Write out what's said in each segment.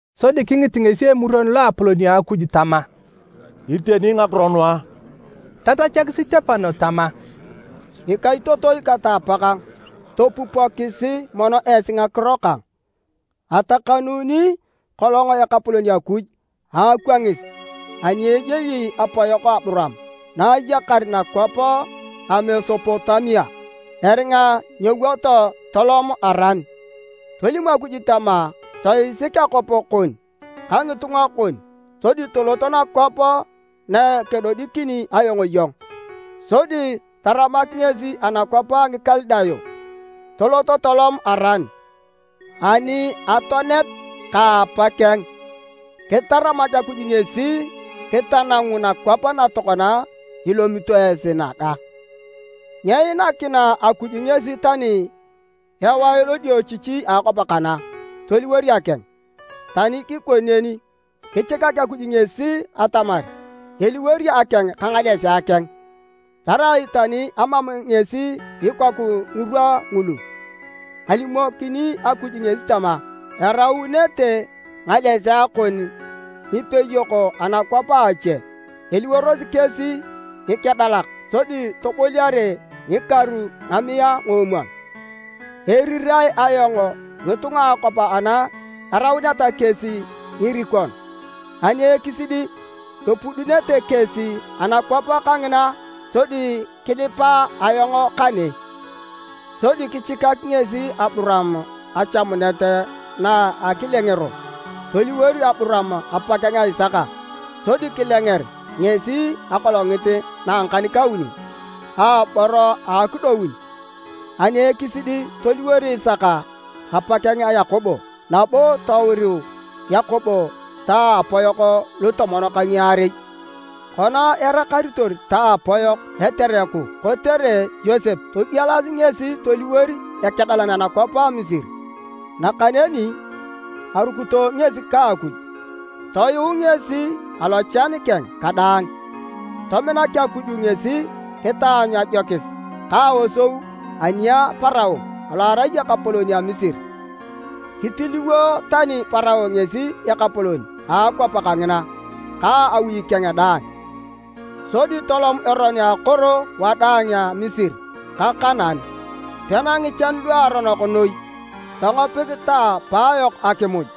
Sodi kingit ngesi Emuron Loapolon a Akuj tama, “Iteni ngakiro nu a?” Tatachak Sitepano tama, “Ngikaitotoi kata apakang, topupokisi mono esi ngakiro kang! Atakanuuni kolong Ekapolon Akuj a akwangis ani eyei apayok Aburaam na ayakar nakwap a Mesopotamia, eringa nyewoto tolom Aran. Tolim Akuj tama, ‘Toisik akwap kon ka ngitunga kon sodi tolot nakwap nakedodikini ayong iyong.’ Sodi taramak ngesi anakwap a Ngikalidayo tolot tolom Aran. Ani atoanet ka apakeng, kitaramak Akuj ngesi kitanangu nakwap na tokona ilomito esi naga. Nyeinakina Akuj ngesi tani ewae lodiochichi a akwap kana toliwor akeng, tani kikoni neni, kichikak Akuj ngesi atamar eliwor akeng ka ngalesea keng, tarai tani amam ngesi ikoku ngirwa ngulu. Alimokini Akuj ngesi tama, ‘Eraunete ngalesea kon ngipeyok anakwap a ache, eliworosi kesi ngikedalak sodi toboliare a ngikaru a ngamiae a ngoomwon. Erirae ayong ngitunga a akwap ana erauneta kesi ngirikon, ani ekisidi epudunete kesi anakwap kangina sodi kelipa ayong kane.’ Sodi kichikak ngesi Aburaam achamunet na a akilengero. Toliwor Aburaam apakeng a Isaka sodi kilenger ngesi akolongit na a ngakan-kauni aabor a akidoun. Ani ekisidi toliwor Isaka apakeng a Yakobo, nabo touri Yakobo ta apayok lutomon ka ngiarei. “Kona erakaritor ta apayok etereku kotere Yosep, togielasi ngesi toliwor ekedalan anakwap a Misiri. Nakaneni arukito ngesi ka Akuj toyuu ngesi alochan keng kadaang. Tominak Akuj ngesi kitaanyu ajokis ka aosou ani a Parao alo arai ekapolon a Misiri. Kitiliwo tani Parao ngesi ekapolon a akwap kangina ka awi keng daang. Sodi tolom eron a akoro wadaang a Misiri ka Kanaan, pena ngichan luaronok noi. Tongopik ta apaayok akimuj,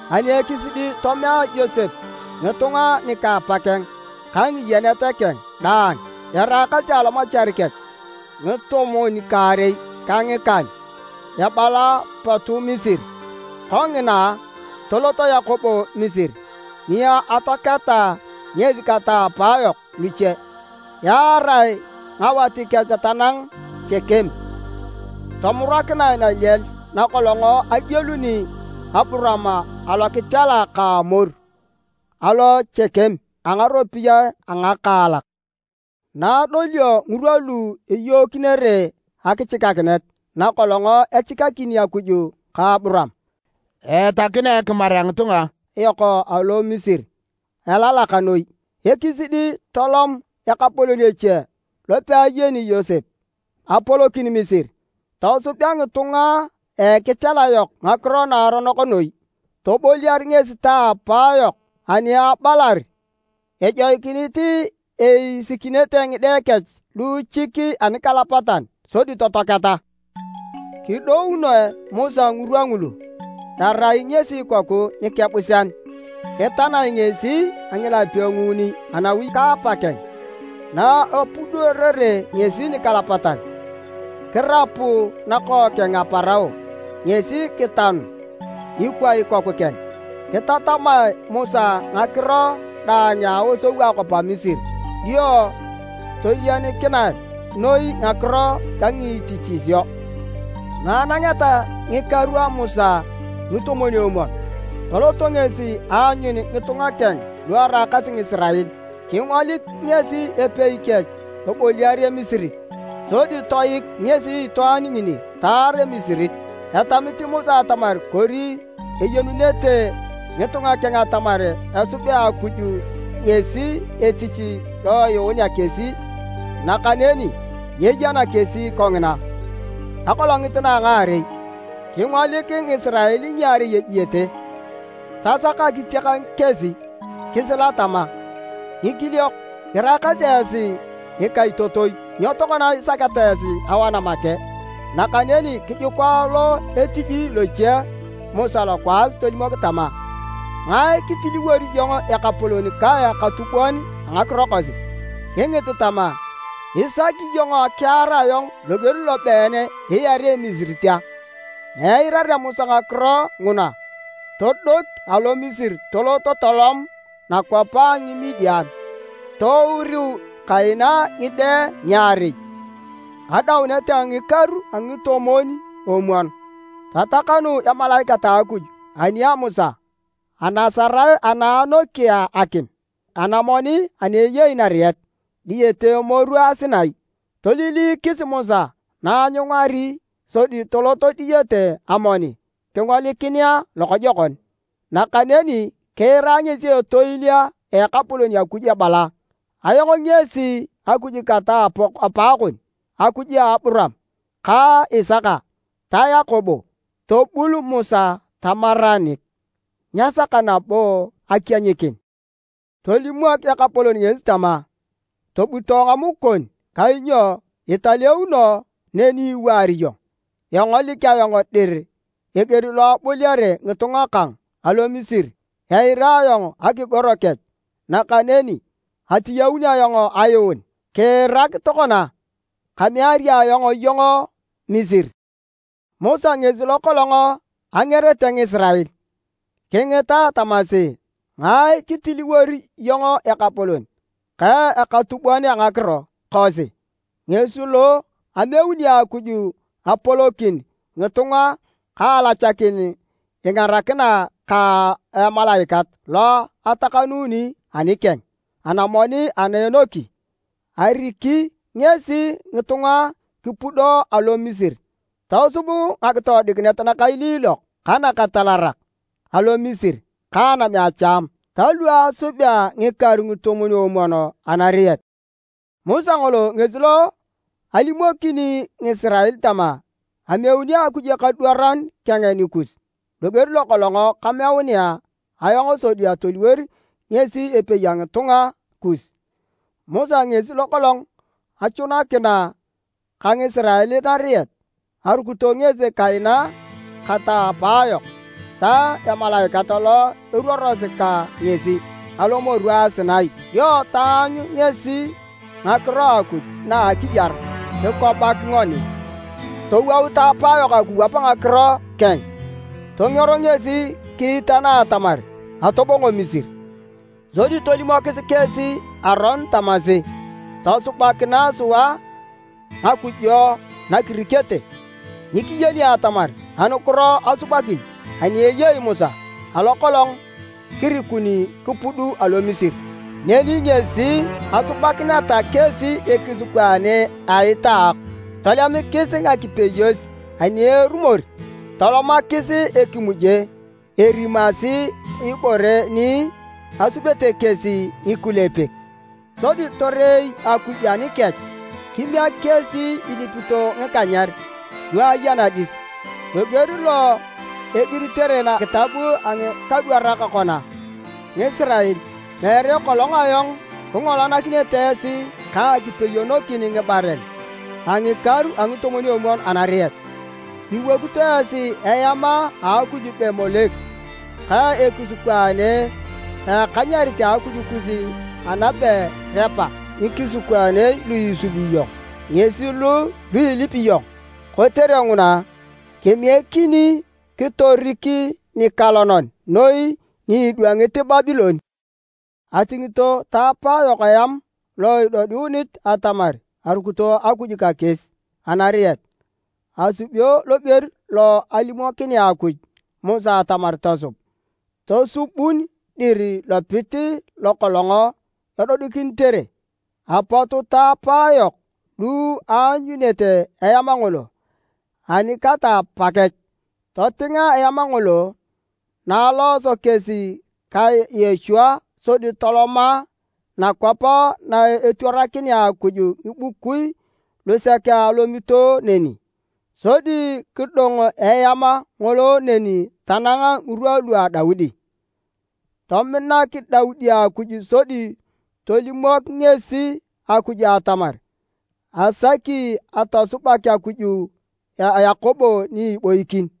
Ani ekisidi, tomea Yosep ngitunga nika apakeng ka ngiyenet keng daang eraakasi alomachar kech ngitomwon-kaarei ka ngikan, ebala potu Misiri. Kongina, tolot Yakobo Misiri ni atoaketa ngesi kata apaayok luche. Yaarae ngawat kech tanang Chekem, tomurakinae naliel nakolong agieluni Aburaam alokitela ka Amor alo Chekem, a ngaropiyae a ngakaalak. “Naadolio ngirwa lu iyookinere akichikakinet nakolong echikakini Akuj Aburaam, eatakina ekimar a ngitunga yok alo Misiri alalak noi. Ekisidi, tolomak ekapolon eche lopeayeni Yosep apolokin Misiri. Tosubea ngitunga a ekitela yok ngakiro naaronok noi. Toboliar ngesi ta apayok ani abalar ejoikinit eisikinete ngide kech luuchik anikalapatan sodi totoaketa. Kidounoe Musa ngirwa ngulu, arai ngesi ikoku nikebusean. Kitanae ngesi a ngilapio a nguuni anawi ka apa keng, na epudunere ngesi nikalapatan, kirapu nakookeng a Parao ngesi kitanu ikwa ikoku keng. Kitatamae Musa ngakiro daang na aosou a akwap a Misiri dio, toyenikinae noi a ngakiro ka ngitichisio. “Naanangeta ngikaru a Musa ngitomwon-omwon, tolot ngesi aanyun ngitunga keng lu eraakasi Ngisirael. Kingolik ngesi epei kech eboliar Emisirit, sodi toik ngesi itwaan ngini taar Emisirit. ( Etamit Musa atamar kori eyenunete ngitunga keng atamar esubea Akuj ngesi etich lo eyuunea kesi, nakaneni nyeyena kesi kongina.) Akolongit na a ngaarei, kingolik Ngisirael ngiarei ejiete. Tasak akitiak kesi kisila tama, ‘Ngikiliok, iraakasi esi ngikaitotoi, nyo tokona isaketa esi awana make?’ Nakaneni kijuka lo etiji loche Musa lokwaas tolimok tama, ‘Ngae kitiliwori iyong ekapolon ka ekatubon ngakiro kosi?’ Kingit tama, ‘Isaki iyong akiar ayong loger lobeen iarea Emisirit a?’ Na eirarea Musa ngakiro nguna, todoki alo Misiri tolot tolom nakwap a Ngimidian. Touriu kaina ngide ngiarei. “Adaunet a ngikaru a ngitomwon-omwon, tatakanu emalaikat a Akuj ani a Musa anasarae ana anokea akim anamoni ana ayei nariet, diyete emoru a Sinai. Toiliilikis Musa na aanyungari, sodi tolot diyete amoni kingolikinea lokojokon. Nakaneni kiira ngesi etoil a Ekapolon Akuj ebala, ‘Ayong ngesi Akuj kata apaakon, Akuj ka Aburaam ka Isaka ta Yakobo.’ Tobul Musa tamaranik, nyesaka nabo akienyikin. Tolimok Ekapolon ngesi tama, ‘Tobuto ngamuk kon kainyo italeuno neni iwaar iyong. Engolik ayong dir eger lo eboliare ngitunga kang alo Misiri. Eira ayong akigoro kech nakaneni atiyaun ayong ayuun. Kiirak tokona, kameari ayong iyong Misiri.’ “Musa ngesi lokolong angerete Ngisirael. Kingita tamasi, ‘Ngae kitiliwori iyong ekapolon ka ekatubon ngakiro kosi?’ Ngesi lo ameuni Akuj apolokin ngitunga ka alachakin ingarakina ka emalaikat lo atakanuuni anikeng anamoni ana anoki. Ariki ngesi ngitunga kipudo alo Misiri, tosub ngakitoodikinet nakailiilok ka nakatalarak alo Misiri ka anam a Chamu ta lu asubi a ngikaru ngitomwon-omwon anariet. Musa ngolo ngesi lo alimokini Ngisirael tama, ‘Emeuni Akuj ekadwaran keng nikus, loger lokolong kameunea ayong sodi toliwor ngesi epei a ngitunga kus.’ Musa ngesi lokolong achunakina ka Ngisirael nariet. Arukito ngesi kaina kata apaayok ta emalaikat lo eruorosi ka ngesi alomoru a Sinai, dio taanyu ngesi Ngakiro a Akuj na a akiyar, kikobak ngoni. “Towout ta apayok akiwap ngakiro keng. Tongero ngesi kiitana atamar atobongo Misiri. Sodi tolimokis kesi Aron tamasi, ‘Tosubakinae sua ngakujo na kirikete. Nyikiyeni atamar anukiro asubakin ani eyei Musa alo kolong kirikuni kipud alo Misiri.’ Neni ngesi asubakineta kesi ekisikwaane a itaok, tolemikis ngakipeyos ani erumor tolomakis ekimuje erimasi ibore ni asubete kesi ngikulepek. Sodi torei Akuj anikech kimiek kesi ilipito ngikanyer lu eya nadis, loger lo igiritere nakitab a ngikadwarak kona, ‘Ngisirael! Meere kolong ayong kingolanakinete esi ka akipeyonokin ngibaren a ngikaru a ngitomwon-omwon anariet. Iwokito esi eam a akuj be Molek, ka ekisikwaane a ekanyerit a akuj kus anabe Repa, ngikisikwaane lu isubi iyong ngesi lu ilipi iyong. Kotere nguna kemiekini kitorik nikalonan noi ni idwangit Babilon.’ “Atingito ta apaayok eam lo edodiunit atamar arukito Akuj ka kesi anariet. Asubio loger lo alimokinea Akuj Musa atamar tosub. Tosubun dir lopit lokolong edodikinitere. Apot ta apaayok lu aanyunete eam ngolo ani kata apaakech, totinga eam ngolo na alooso kesi ka Yochua sodi toloma nakwap na etwarakinea Akuj ngibukui lusek alomito neni. Sodi kidong eam ngolo neni tanang ngirwa lua Daudi. Tominak Daudi Akuj sodi tolimok ngesi Akuj atamar asaki atosubak Akuj a Yakobo ni iboikin.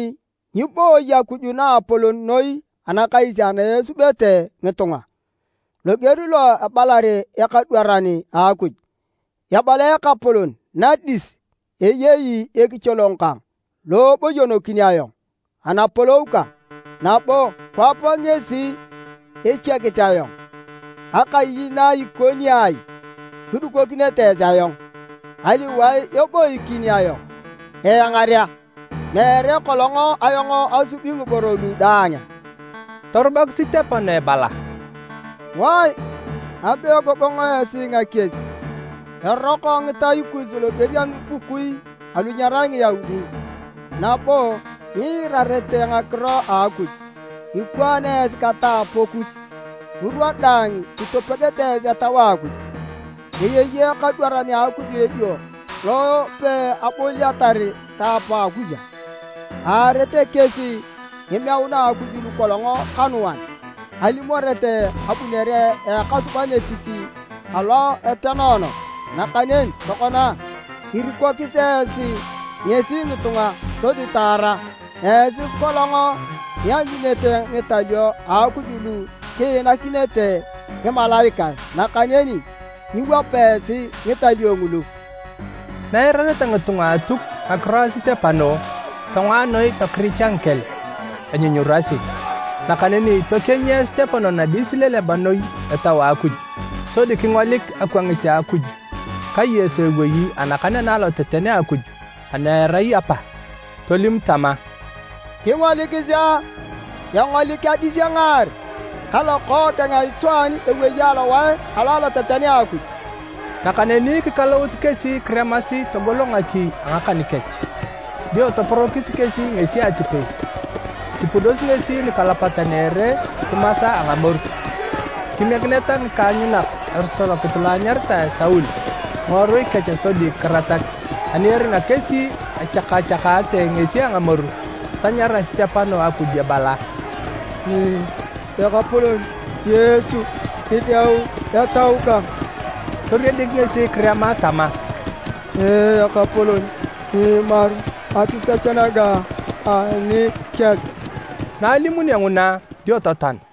“Nakaneni nyibooyi Akuj naapolon noi anakais ana esubete ngitunga, loger lo ebalar ekadwaran a Akuj, ‘Ebala Ekapolon, nadis eyei ekicholong kang lo eboyonokin ayong anapolou kang, nabo akwap ngesi echiakit ayong. Akai na ikoni ai kidukokinete esi ayong? Aliwae eboikin ayong eangarea? Meere kolong ayong asubi ngiboro lu daang a?’” Torubak Sitepano ebala, “Wae, abe egogong esi ngakies! Eroko ngitai kus loger a ngibukui alu nyerai Ngiyaudi nabo nyiirarete ngakiro a Akuj. Ikwaan esi ka ta apaakus. Ngirwa daang itopegete esi Etau a Akuj. Eyei ekadwaran a Akuj edio lo peaboliatar ta apaakus a? Aarete kesi ngimeuna a Akuj lukolong kanuan alimorete abunere a Ekasuban etich alo etenoono. Nakaneni tokona, irikokis esi ngesi ngitunga sodi taara. Esi kolong ianyunete ngitalio a Akuj lu kiinakinete ngimalaikae, nakaneni nyiwapa esi ngitalio ngulu!” Na eirakineta ngitunga a Atuk ngakiro a Sitepano, tongoa noi tokiricha ngikel enyunyurasi. Nanakeni tokienyia Sitepano nadis ileleba noi Etau a Akuj. Sodi kingolik akwangis a Akuj ka Yesu ewei anakan ana aloteten a Akuj ana erai Apa. Tolim tama, “Kingolikisi a, engolik adis engaar ka Lokookeng a Itwaan ewei alowae alo aloteten a Akuj!” Nakaneni kikalout kesi kiremasi togolo ngaki a ngakan kech. Dio toporokis kesi ngesi atipei, kipudosi ngesi nikalapatan a ere kimasa a ngamoru. Kimiekineta ngikaanyunak esorokit lo anyaritae Saul ngiworui kech sodi kiratak. Ani eringa kesi echakachakaate ngesi a ngamoru, tanyara Sitepano Akuj ebala, “Ekapolon Yesu, kideu etau kang!” Toriedik ngesi kirema tama, “Ekapolon! Nyiimaru akisech naga anikech!” Na alimunio nguna, dio totoan.